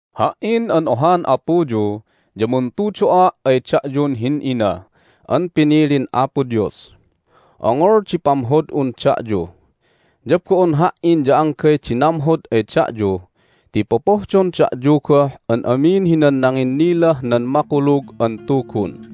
Ha"in an ohan apuyu ya muntudo'a' ay da'yun hin'ina an pinilin Apo Dios. Ongol di pamhod'un da'yu. Ya bo'on ha"in ya anggay di namhod ay da'yu ti popohdon da'yu goh an amin hinan nanginnilah nan Makulug an Tugun.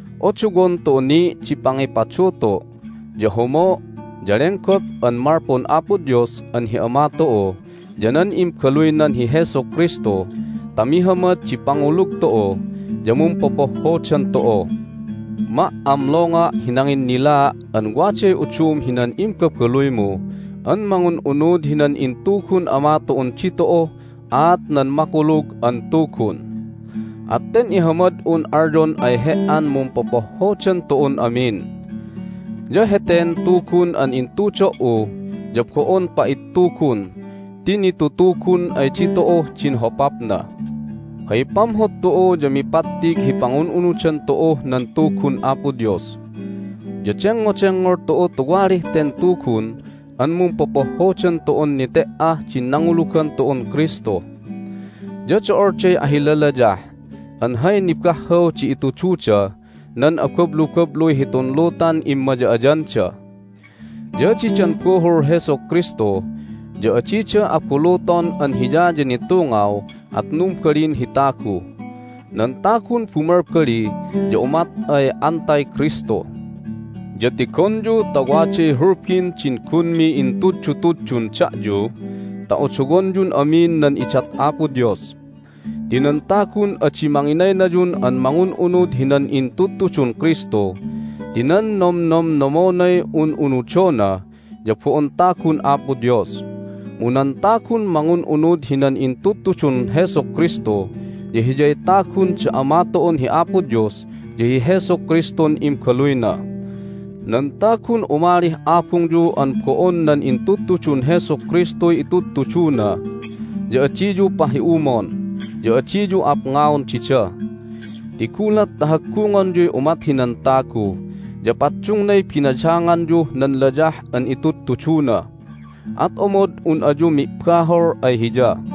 Odowon tu'u ni' di pangipadutu', ya homo', ya lenggop an malpun Apo Dios an hi Ama tu'u ya nan Imbaluynan hi Jesu Kristu ta mihamad di pangulug tu'u ya mumpopohhodan tu'u. Ma"amlonga' hi nanginnilaa' an waday udum hinan imbabaluymu an mangun'unud hinan intugun Ama tu'un ditu'uh aat nan Makulug an Tugun. At ten ihamad'un alyon ay he"an mumpopohhodan tu'un amin. Ya heten Tugun an itudo"u ya bo'on pa'ittugun ti nitutugun ay ditu'uh din hopapna. Hay pamhod tu'u ya mipattig hi pangun'unudan tu'uh nan Tugun Apo Dios. Ya dengngodengngol tu'u tuwalih ten Tugun an mumpopohhodan tu'un nete"ah din nangulugan tu'un Kristu. Ya do'olday ahilalayah an hay nibahhaw di itududah nan abablubabluy hitun lutan immaya'ayanda. Ya didan buhul Jesu Kristu ya adida abuluton an Hiya ya nitungaw, at numbalin hi tagu. Nan tagun bumalbali ya umat ay AntiKristu! Ya tigonyu ta waday hulbin din gunmi intuddutuddun da'yu ta odowonyun amin nan idat Apo Dios. Ti nan tagun adi manginaynayun an mangun'unud hinan intudtudun Kristu ti nan nomnomnomonay un'unudona ya bo'on tagun Apo Dios. Mu nan tagun mangun'unud hinan intudtudun Jesu Kristu ya hiyay tagun da Ama tu'un hi Apo Dios ya hi Jesu Kristun Imbaluyna. Nan tagun umalih abungyu an bo'on nan intudtudun Jesu Kristuy itudtuduna ya adiyu pahi'umon, ya adiyu apngaon dida. Ti gulat ta haggungonyuy umat hinan tagu ya paddungnay binadanganyuh nan layah an itudtuduna, at omod un ayu mi'bahol ay hiya.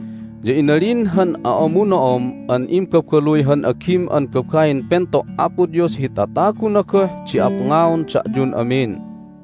Ya inalin han a'amuno'om an imbabaluy han agim an babain pento' Apo Dios hi tataguna goh di apngaon da'yun amin.